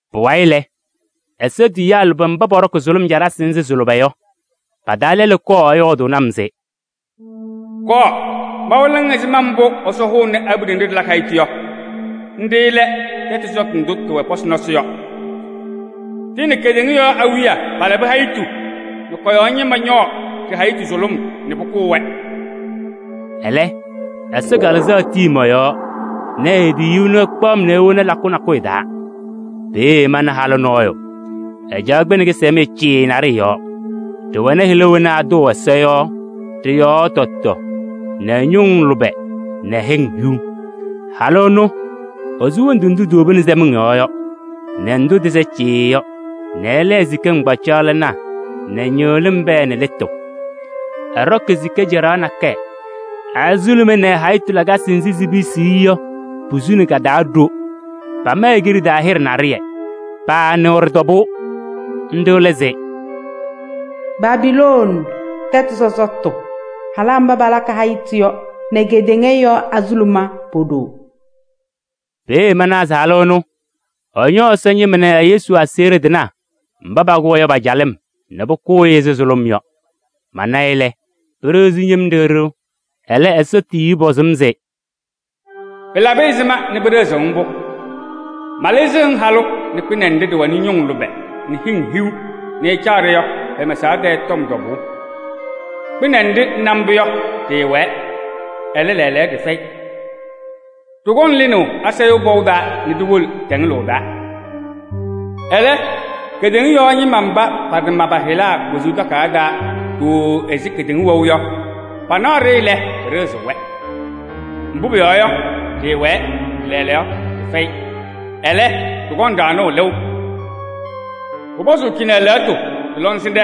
Pʋwayɩ lɛ, Ɛsɔ tiyiyaa lʋbɛ mba pɔɖɔkɩ sʋlʋm caɖasɩ nzɩ sɩ-lʋbɛ yɔ, pa-taa lɛlʋ kɔɔ ɛyɔɔdʋʋnɩ-m se: “Kɔɔ, mawɩlɩɣ-ŋ ɛzɩma mbʋ Ɛsɔ hʋʋnɩ abiɖe nɖɩ ɖɩpɛdɩɣ ɖɩ-tɩ yɔ. Nɖɩ lɛ tɛtʋ sɔsɔtʋ ndʋ tɩwɛ pɔsɩ nɔsɩ yɔ. Tɩ nɛ kedeŋa yɔɔ awiya palabɩ hayitu nɛ kɔ-yɔɔ ñɩma ñɔɔ ɖɩ-hayitu sʋlʋm nɛ pʋkʋʋ-wɛ.” Ɛlɛ Ɛsɔ Kalɩzaɣ tii mɔ-yɔɔ nɛ e-tiyiyu ɛnʋ ɛkpaɣ-m nɛ ewoni lakʋ nakʋyʋ taa. Peeye mana halʋ nɔɔyʋ, ɛcaɣ kpɩnɛ kɩsɛmɖɩyɛ cɩɩɩ naɖɩyɛ yɔɔ. Ɖɩwɛnɩ hɩla wena atʋʋ Ɛsɔ yɔ ɖɩ-yɔɔ tɔtɔ nɛ ñʋŋ lʋbɛ nɛ hɩŋ hiu. Halʋ ɛnʋ, esu wondu ndʋ tiwobini sɛmɩŋ yɔɔ yɔ nɛ ndʋ tɩsɛ cɩɩɩ yɔ nɛ ɛlɛɛ sika nɩŋgbacaɣlɩnaa nɛ ñɩɣlɩm pɛɛ nɛ lɩtʋ. Ɛɖɔkɩ sika caɖaɣ nakɛyɛ, ɛ-azuluma nɛ ɛ-hayitu lakasɩ nzɩ sipisiɣ-i yɔ posuni ka-taa ɖo. Pama e-kiɖe taa hɩɖɛ naɖɩyɛ. Paanɩɣ ɖɩ-tɔbʋʋ, nɖɩ lɛ se: “Babilooni tɛtʋ sɔsɔtʋ, halaa mba pɛpɛdɩɣ pa-tɩ yɔ nɛ kedeŋa yɔɔ azuluma po-ɖoo.” Peeye manawa se halʋ ɛnʋ ɛñɔ Ɛsɔ ñɩma nɛ Yesu aseɣɖe tɩnaa mba pakʋ-wɛ yɔ pa-calɩm nɛ pʋkʋʋ-ɩ ɛzɩ sʋlʋm yɔ. Mana-ɩ lɛ, pɩɖɩɣzɩ-m yem ɖɩɣ ɖɩɣ. Ɛlɛ, Ɛsɔ tiyiyu pɔzɩ-m se: “Pɩlabɩ ɛzɩma nɛ pɩɖɩɣzɩɣ-ŋ mbʋ? Malɩzɩɣ-ŋ halʋ nɛ kpɩnɛ nɖɩ ɖɩwɛnɩ ñʋŋ lʋbɛ nɛ hɩŋ hiu nɛ ɛcaɣ-ɖɩ yɔ pɛ-mɛsaɣ tɛɛ tɔm tɔbʋʋ. Kpɩnɛ nɖɩ ŋna mbʋ yɔ, ɖɩɩwɛɛ, ɛlɛ, lɛɛlɛɛyɔ ɖɩfɛyɩ. Ɖɩkɔŋ lɩnaʋ asayʋʋ pɔʋ taa nɛ ɖiwolo tɛŋɛlʋʋ taa. Ɛlɛ kedeŋa yɔɔ ñɩma mba patama pa-hɩla wezuu takayaɣ taa ɖooo ɛzɩ kedeŋa wɛʋ yɔ, panaɣ-ɖɩ lɛ, pɩɖɩɣzɩɣ-wɛ. Mbʋ pʋyɔɔ yɔ, ɖɩɩwɛɛ nɛ lɛɛlɛɛyɔ ɖɩfɛyɩ, ɛlɛ, ɖɩkɔŋ ɖaɣnʋʋ lɩʋ. “Pʋpɔzʋʋ cɩnɛ lɛɣtʋ nɛ lɔŋsɩnɖɛ: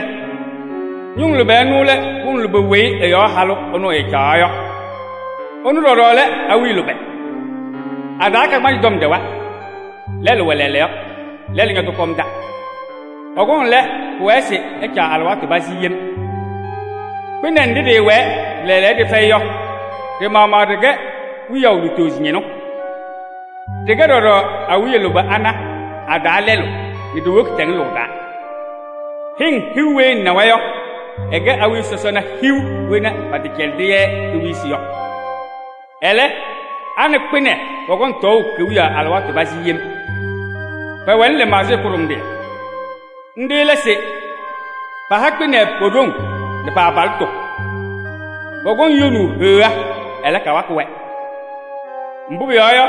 ñʋŋ lʋbɛ ɩnʋ lɛ pʋŋ lʋbɛ weyi ɩ-yɔɔ halʋ ɛnʋ ɛcaɣaɣ yɔ. Ɩnʋ ɖɔɖɔ lɛ awiya lʋbɛ: a-taa kagbaanzɩ tɔm ɖɛwa, lɛlʋ wɛ lɛɛlɛɛyɔ, lɛlʋ ñɔtɔkɔmda. Ɛkɔŋ lɛ, pʋwɛɛ se ɛcaɣ alɩwaatʋ pazɩ yem. Kpɩnɛ nɖɩ ɖɩɩwɛɛ nɛ lɛɛlɛɛyɔ ɖɩfɛyɩ yɔ, ɖɩ-maɣmaɣ ɖɩkɛ wiyaʋ lutozo ñɩnʋ. Ɖɩkɛ ɖɔɖɔ awiya lʋbɛ ana a-taa lɛlʋ nɛ ɖiwoki tɛŋɛlʋʋ taa. “Hɩŋ hiu weyi ŋnawa yɔ, ɩkɛ awiya sɔsɔna hiu wena pɛtɛcɛlɩdɩ-yɛ kewiyisi yɔ. Ɛlɛ, a nɛ kpɩnɛ pɔkɔŋ tɔɔʋ kewiyaɣ alɩwaatʋ pazɩ yem. Pɛwɛnɩ lɩmaɣzɩyɛ kʋɖʋmɖɩyɛ. Nɖɩ lɛ se: paha kpɩnɛ po-ɖoŋ nɛ pa-abalɩtʋ. Pɔkɔŋ yonaʋ Heɣa, ɛlɛ, kawakɩ-wɛ. Mbʋ pʋyɔɔ yɔ,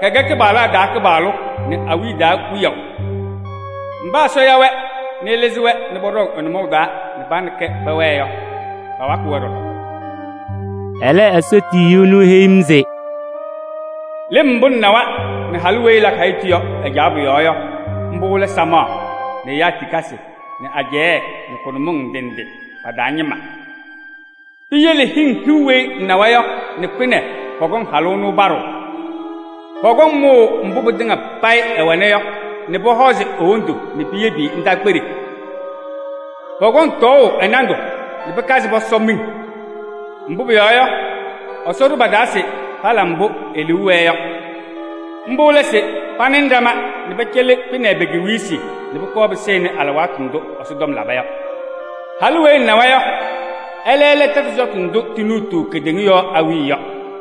kɛkɛ kɩpaɣlaa taa Kɩpaɣlʋ nɛ awiya taa Wiyaʋ. Mba Ɛsɔ ya-wɛ nɛ ɛlɩzɩ-wɛ nɛ pɔɖɔŋ ɛ-nʋmɔʋ taa nɛ pa nɛ kɛ pɛwɛɛ yɔ, pawakɩ-wɛ ɖɔɖɔ.” Ɛlɛ, Ɛsɔ tiyiyu ɛnʋ eheyi-m se: “Lɩm mbʋ ŋnawa nɛ halʋ weyi ɛpɛdɩɣ ɛ-tɩ yɔ ɛcaɣ pʋ-yɔɔ yɔ, mbʋ lɛ samaɣ nɛ ɛyaa tikasɩ nɛ ajɛɛ nɛ kʋnʋmɩŋ ndɩ ndɩ pa-taa ñɩma. Piyele hɩŋ hiu weyi ŋnawa yɔ nɛ kpɩnɛ pɔkɔŋ halʋ ɛnʋ paɖʋʋ: pɔkɔŋ mʋʋ mbʋ pɩtɩŋa payɩ ɛwɛna yɔ nɛ pɔhɔzɩ e-wondu nɛ piyebi-i ndaakpeɖe. Pɔkɔŋ tɔɔʋ ɛ-nandʋ nɛ pɩkazɩ pɔsɔ miŋ. Mbʋ pʋyɔɔ yɔ, Ɛsɔ ɖʋ pa-taa se pala mbʋ e-liu wɛɛ yɔ. Mbʋ lɛ se panɩnɩ ɖama nɛ pɛcɛlɩ kpɩnɛ pe-kewiyisi nɛ pʋkɔɔ pɩsɩnɩ alɩwaatʋ ndʋ Ɛsɔtɔm laba yɔ. “Halʋ weyi ŋnawa yɔ, ɛlɛ lɛ tɛtʋ sɔsɔtʋ ndʋ tinuutuu kedeŋa yɔɔ awiya yɔ.”